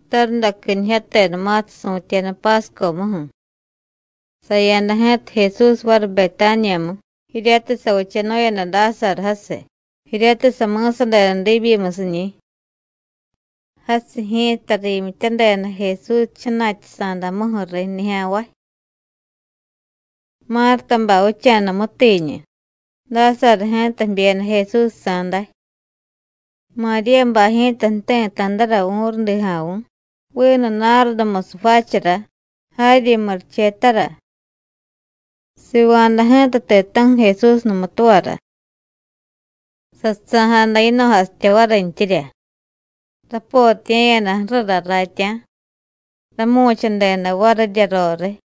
Tarundaquinijyatenumatiy su̱tyeda Páscomuju̱, saya̱da ji̱ta Jesús variy Betániyamu, jiryatiy savichanu̱yada Dásaru jasiy, jiryatiy sami̱sadeda diibyimusiñi̱. Jasiy ji̱ta riimyityadeda Jesús jchana̱tyasa̱damuju̱ riy nijya̱nvay. Mártabay vicha̱da mútiiñu, Dásaru ji̱ta jbyeda Jesúsjsa̱ day. Maríyabay ji̱ta jti̱ta̱dara vu̱rudija̱vu̱ vinu nárdumusiy jvaachara, jaryi murichetara. Siva̱da ji̱ta ti̱ta̱ju̱ Jesús numutuvara. Sasusa̱jada yino̱jasitya varintyirya. Rapotiye̱yada ju̱rura raatya̱, ramu̱chadeda varirya roriy.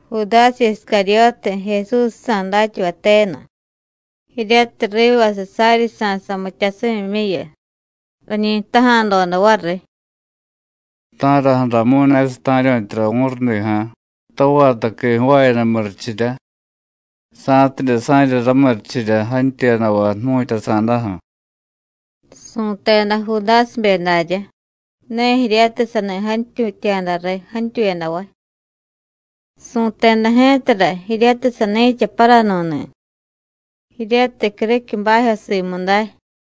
Judásiy Iscaryótiy, Jesúsjsa̱ datyavay tenu, jiryatiy rivasiy saryi sa̱y samityasimyimyuyu, rañi jtaja̱doda variy: “¿Ta̱raju̱ramu̱y ne sata̱ryu̱tyara vu̱rudija̱, tavaataqui jvaayada murichirya, sa̱tidye sa̱rya ramurichirya jantyuyadavay jmu̱tyasa̱daju̱?” Su̱teda Judásibe daryá, ne jiryatiy sani jantyutya̱da riy jantyuyadavay. Su̱teda ji̱tara jiryatiy sani̱cha paranu̱ni̱, jiryatiy criquiy bajyo simu day,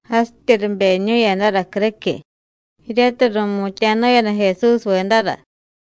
jasityi ribeñu̱yadara criquiy, jiryatiy ru̱mutya̱nu̱yada Jesúsvedara.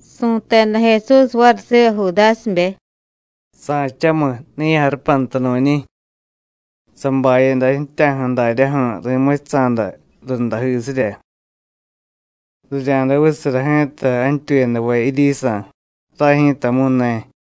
Su̱teda Jesús variy siva Judásibe: “Sa̱chamiy, ne ya̱jarupanta nu̱nñi̱. Sabayada ji̱tyaju̱ daryaju̱ ri̱muchusa̱da rundajisirya. Rirya̱day vichasara ji̱ta jantyuyadavay jiryisa̱, ray ji̱tamu̱y ne.”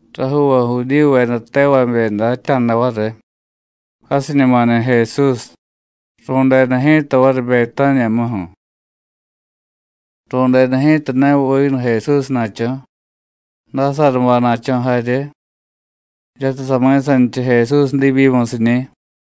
Rajuuvay Judíyuveda tevabe datya̱da variy: Jasiñumani̱ Jesús, ru̱deda ji̱ta variy Betániyamuju̱. Ru̱deda ji̱ta ne vinu Jesúsna̱cho̱, Dásarubay na̱cho̱ jarye, jiryatiy sami̱sanichiy Jesús diibyimusiñi̱.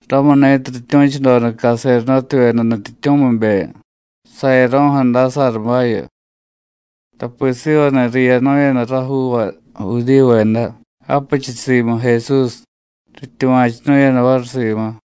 Ramuni̱tiy rityu̱chudoda caserdótevyeda nutyityu̱mibe sayaro̱ju̱ Dásarubayu, tapi sivani̱ riyanu̱yada rajuuvay Judíyuveda japichiy simu Jesús, rityuva̱chunu̱yada variy simu.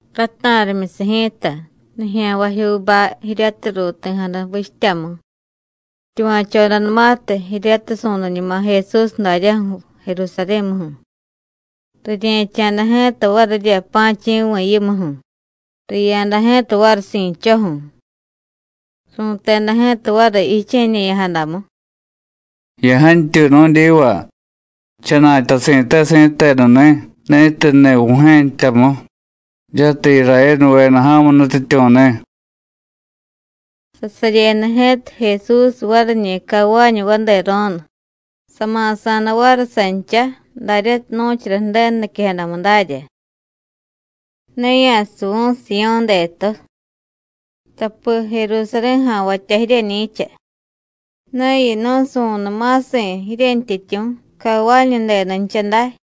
Rata̱rimyusiy ji̱ta, nijya̱nvajyuubay jiryatiy ruuti̱jada vichtyamu, rityuva̱chodanumatiy jiryatiy su̱niñuma Jesús daryaju̱ Jerusarí̱muju̱, rirye̱cha̱da ji̱ta varirya pa̱chi̱vi̱ yimuju̱, riya̱da ji̱ta variy si̱dcho̱ju̱. Ru̱teda ji̱ta variy jiche̱ñe̱ya̱jadamu: “¡Ya̱jantyuy nu̱dyiva! ¡Jchana̱tyasi̱te si̱tenu ni̱ ni̱tiy jniy Vu̱jye̱ jtyamu, jiryatiy Irayénuveda ja̱mu nutyityu̱ni̱!” Sasaryeda ji̱ta Jesús variñi̱ cavañu vadero̱nu, sama̱sa̱da variy sancha daryatiy nu̱chara Ju̱denu niquejadamu dárya: “Ne ya̱suvu̱y Siyó̱ detu, (tapi Jerusarí̱ja̱nvatya jiryeñi̱cha), ne yinu̱y su̱niy ma̱si̱ jiryentyityu̱ cavañudenuncha day.”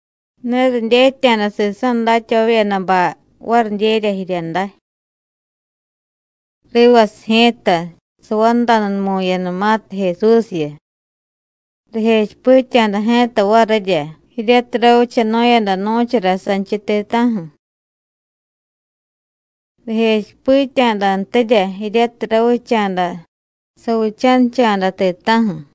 Ne ridyetya̱da sisa̱ datyavavyedabay varidyerya jirya day. Rivasiy ji̱ta savandanumu̱yadanumatiy Jesúsyu, rijechipitya̱da ji̱ta varirya jiryatiy ravichanu̱yada nu̱chara sanchiy ti̱ta̱ju̱. Rijechipitya̱dantirya jiryatiy ravicha̱da savichanicha̱da ti̱ta̱ju̱.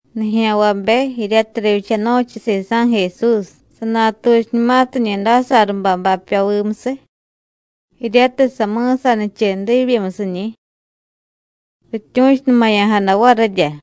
Nijya̱nvabe jiryatiy rivyichanu̱chiy sisa̱ Jesús, sanatuchiñumatiñi̱ Dásarubay bapyovimusiy, jiryatiy sami̱sanichiy diibyimusiñi̱, rityu̱chunumaya̱jada varirya.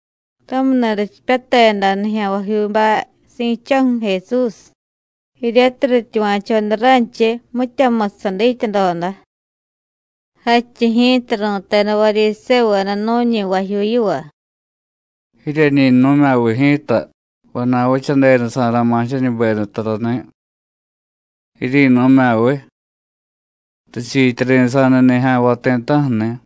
Ramuni̱ richipyateda nijya̱nvajyuubay si̱dcho̱ju̱ Jesús, jiryatiy rityuva̱choda ranchiy mityamusiy sadityadoda. Jadchiy ji̱ta ru̱teda Varyisévuveda nu̱ñi vajyuu yiva: “¡Jiryeñi jnu̱mya̱viy ji̱ta, vana̱y vichadedasa̱ra̱ma̱ jiryeñuberiy tarani̱! ¡Jiryi̱nu̱mya̱viy, richiityari̱sa̱níy nijya̱nvay ti̱ta̱ju̱ni̱!”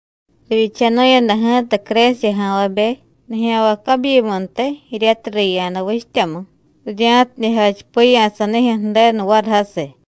Rivyichanu̱yada ji̱ta Crésiya ja̱nvabe nijya̱nvay cabyimuntiy jiryatiy riya̱da vichtyamu, rirya̱tidye jachipiya̱ sanijyu̱ Ju̱denu variy jasiy.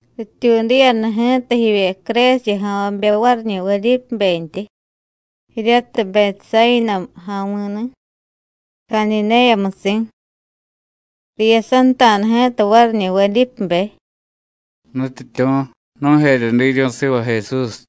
Rityuudiyada ji̱ta jivye Crésiya ja̱nvabe variñi̱ Vedípebentyi, jiryatiy Betsáyina ja̱mi̱ni̱, Cadidéyamusi̱. Riyasanta̱da ji̱ta variñi̱ Vedípebe: “Nutyityu̱, nu̱jerye diryu̱y siva Jesús.”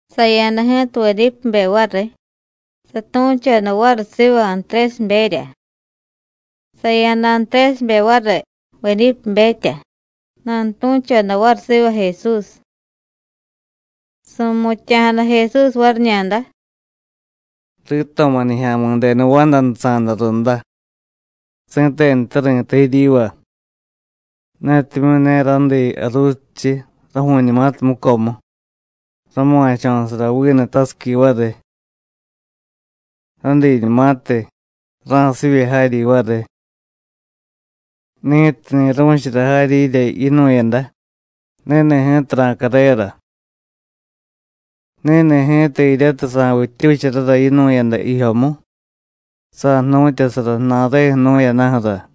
Saya̱da ji̱ta Vedípebe variy, satu̱choda variy siva Antrésiberya. Saya̱da Antrésibe variy Vedípebetya, nanutu̱choda variy siva Jesús. Su̱mutya̱jada Jesús variñada: “Rito̱ma̱ Nijya̱mi̱denu vandanusa̱da runda. Si̱tenute ri̱tay jiryiva: Netimyu̱ ne rádiiy jaruusichiy raju̱u̱ñumatiy mucomu, rama̱cho̱sara vinu tasiqui variy. Rádiiñumatiy, ra̱sivye jaryi variy. Ni̱tiy ni̱ru̱chara jaryirya yinu̱yada, ni̱ni̱ ji̱ta ra̱carera. Ni̱ni̱ ji̱ta jiryatiy sa̱vittyucharara yinu̱yada jijyomu, sa̱jnu̱tyasara ju̱na̱reju̱ jnu̱yadaju̱ra.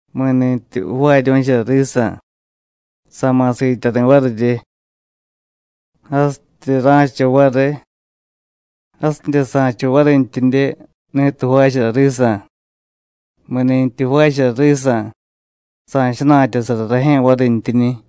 Mi̱ni̱tyi jvaaryu̱chara risa̱, sa̱ma̱ siityari̱ varirye. Jasityi ra̱cha variy, jasidye sa̱cha varintyidye ni̱tiy jvaachara risa̱. Mi̱nintyi jvaachara risa̱, sa̱jchana̱tyasara rajye̱ varintyiñi̱.”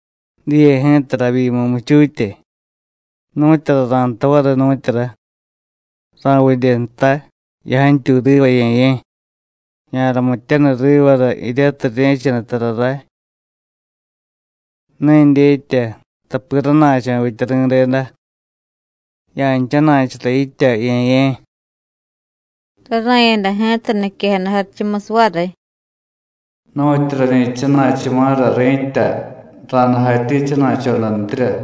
“Diye ji̱ta ravyimu muchutye. ¿Nu̱tyura ra̱jtay variy, nu̱tyura? ¿Ra̱vidye jtay: Ya̱jantyuy riva, Ye̱ye̱. Ya̱ramityaniy rivara jiryatiy rirye̱chaniy tara ray? Ne dyetya, tapi rana̱cho̱ vitya ri̱deda. Ya̱jchana̱chura yitya, Ye̱ye̱.” Rara̱yada ji̱ta niquejada jarichumusiy variy: “Nu̱tyu rañi jchana̱chuma̱ra ri̱tya, ra̱day jatyi jchana̱chodantirya.”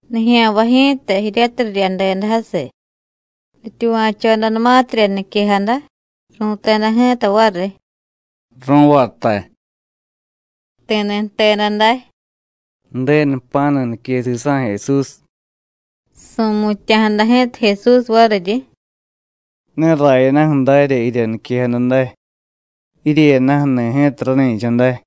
Nijya̱nvay ji̱ta jiryatiy riryadeda jasiy, rityuva̱chodanumatirya niquejada, ru̱teda ji̱ta variy: “Ru̱vatay.” Ti̱ni̱ jteda day: “¡Ju̱denu jpa̱nu nique sisa̱ Jesús!” Su̱mutya̱jada ji̱ta Jesús variryi: “Ne rayadaju̱ darya jirya niquejada day. Jiryeyadaju̱ni̱ ji̱ta rani̱cha day.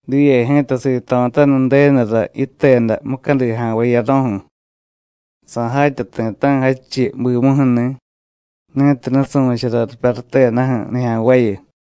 Diye ji̱ta sito̱taniy Ju̱denura yiteda mucadi ja̱nvay jiyaro̱ju̱, sa̱jatya ti̱ta̱ju̱ jadchiy bimuju̱ni̱ ni̱tiy nusu̱chara ripyarutedaju̱ nijya̱nvayu.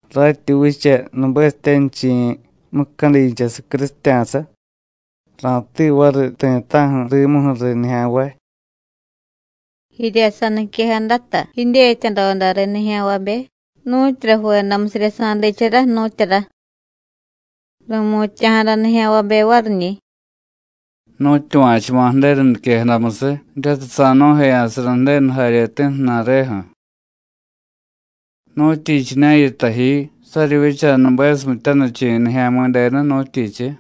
Ratyi vicha nubesityanichi̱ mucadinchasiy crusitya̱sa, ra̱tiiy variy ti̱ta̱ju̱ rimuju̱ riy nijya̱nvay.” Jirya saniquejadata, jidyetyadoda riy nijya̱nvabe nu̱tyura jvedamusirya sa̱diichara, nu̱tyura. Ru̱mutya̱jada nijya̱nvabe variñi̱: “Nu̱tyuva̱chuma̱ Ju̱denu niquejadamusiy jiryatiy sa̱jnu̱jeya̱sara Ju̱denu jaryeti̱ ju̱na̱reju̱. ¿Nu̱tyichiña̱ yitay ji saryi vicha nubesityanichi̱ Nijya̱mi̱denu, nu̱tyichiy?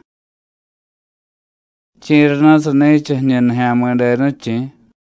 ¿Chi̱rana̱ sani̱cha jiñu Nijya̱mi̱denu, chi̱?”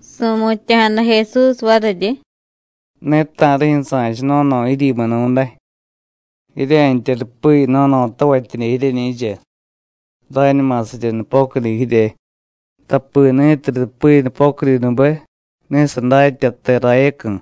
Su̱mutya̱jada Jesús variryi: “Ne ta̱rijyu̱ sa̱cha no̱no̱ jiryimunu̱day. Jirya̱ntya rupi no̱no̱tavatyidye jiryeñi̱cha, rañuma sarye nupocudi jirye, tapi ni̱tiy rupi nupocudinube, ne sadatya te rayacu̱.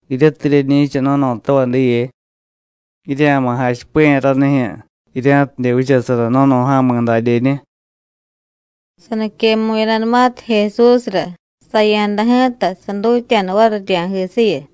Jiryatiy jiryeñi̱cha no̱no̱tavay diye, jirya̱ma̱ jachipiya̱ ranijyu̱, jirya̱tidye vichasara no̱no̱ja̱mi̱ dadyeñu.” Saniquemu̱yadanumatiy Jesúsra, saya̱da ji̱ta, sadutya̱da variy rirya̱jisiyu.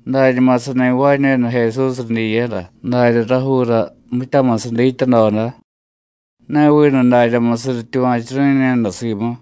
Dañuma sani jvaañu̱yada Jesús ridyiyara darya rajuura mityamusiy dityadoda, ne vinu daryamusiy rityuva̱churu̱ñu̱yada simu.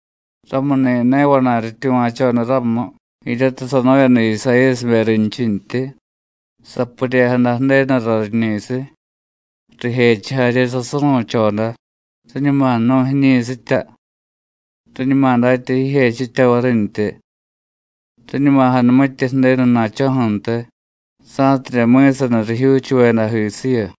Ramuni̱ ne vana̱y rityuva̱choda ramu jiryatiy sanu̱yada Isayíyasibe rinchintyi: “Sapuryejada Ju̱denura riñi̱siy, rijechiy jarye sasuru̱choda, riñuma jnu̱y jiñi̱sitya, riñuma datya jijechitya varintyi, riñuma janumitye Ju̱denu na̱cho̱ju̱ntiy sa̱tidye mi̱saniy rijyuuchuvedajisiyu.”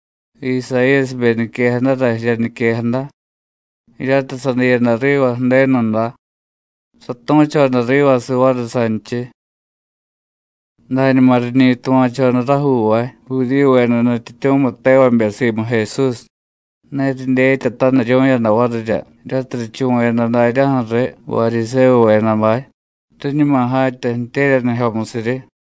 Isayíyasibe niquejadara jirya niquejada, jiryatiy sadiyada riva Ju̱denuda, satu̱choda rivasiy variy sanchiy. Dañuma riñi tuva̱choda rajuuvay Judíyuveda nutyityu̱miy tevabe simu Jesús, ne ridyetyataniryu̱yada varirya, jiryatiy richuvu̱yada daryaju̱ riy Varyisévuvedabay, riñuma jatya ju̱tye̱ryanijyomusiryi.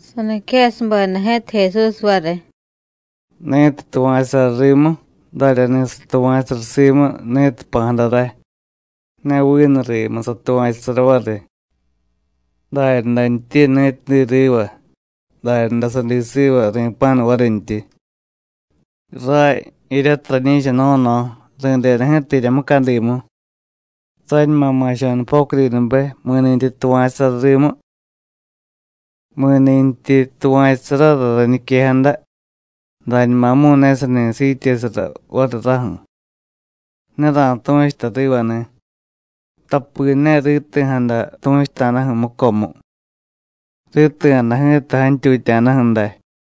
Saniquejasubeda ji̱ta Jesús variy: “Ni̱tiy tuva̱chusara rimu, daryani̱ satuva̱chusara simu ni̱tiy jpa̱jada ray, ne vinu rimu satuva̱chusara variy. Daryadantyi ni̱tiy diy riva, daryaday sadiy siva ri̱pa̱nu varintyi. Ray jiryatiy rañi̱cha no̱no̱, ri̱deda ji̱ta jirya mucadimu, sañuma ma̱cho̱ nupocudinube mi̱ni̱tyi tuva̱chusara rimu. Mi̱nintyi tuva̱chusarara rañiquejada, dañumamu̱y ne sani siityesara variy raju̱, ne ra̱tu̱chuta rivani̱, tapi ne riti̱jada tu̱chuta̱daju̱ mucomu; riti̱jada ji̱ta jantyutya̱daju̱ day.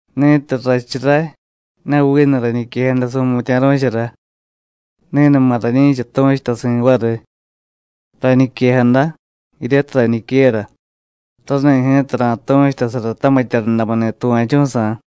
Ni̱tiy rrachu ray, (ne vinu rañiquejada su̱mutya̱ru̱chara), ni̱numa rañi̱cha tu̱chutasi̱ variy. Rañiquejada, jiryatiy rañiquera, rani̱ ji̱ta ra̱tu̱chutasara tamitya rundamuni̱ tuva̱chu̱sa̱.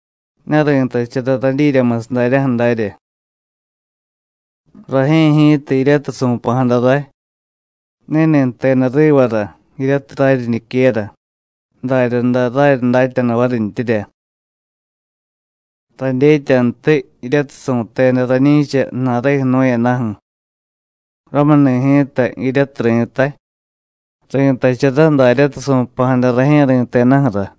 Ne ri̱tachara radyiryamusiy daryaju̱ darya. Rajye̱ ji̱ta, jiryatiy su̱pa̱jada ray, ni̱ni̱ jteda rivara jiryatiy raryi niquera, daryaday raryi datyanu varintyirya. Radyetyantiy jiryatiy su̱teda rañi̱cha ju̱na̱reju̱ jnu̱yadaju̱. Ramuni̱ ji̱ta, jiryatiy ri̱tay, ri̱tachara daryatiy su̱pa̱jada rajye̱ ri̱tedaju̱ra.”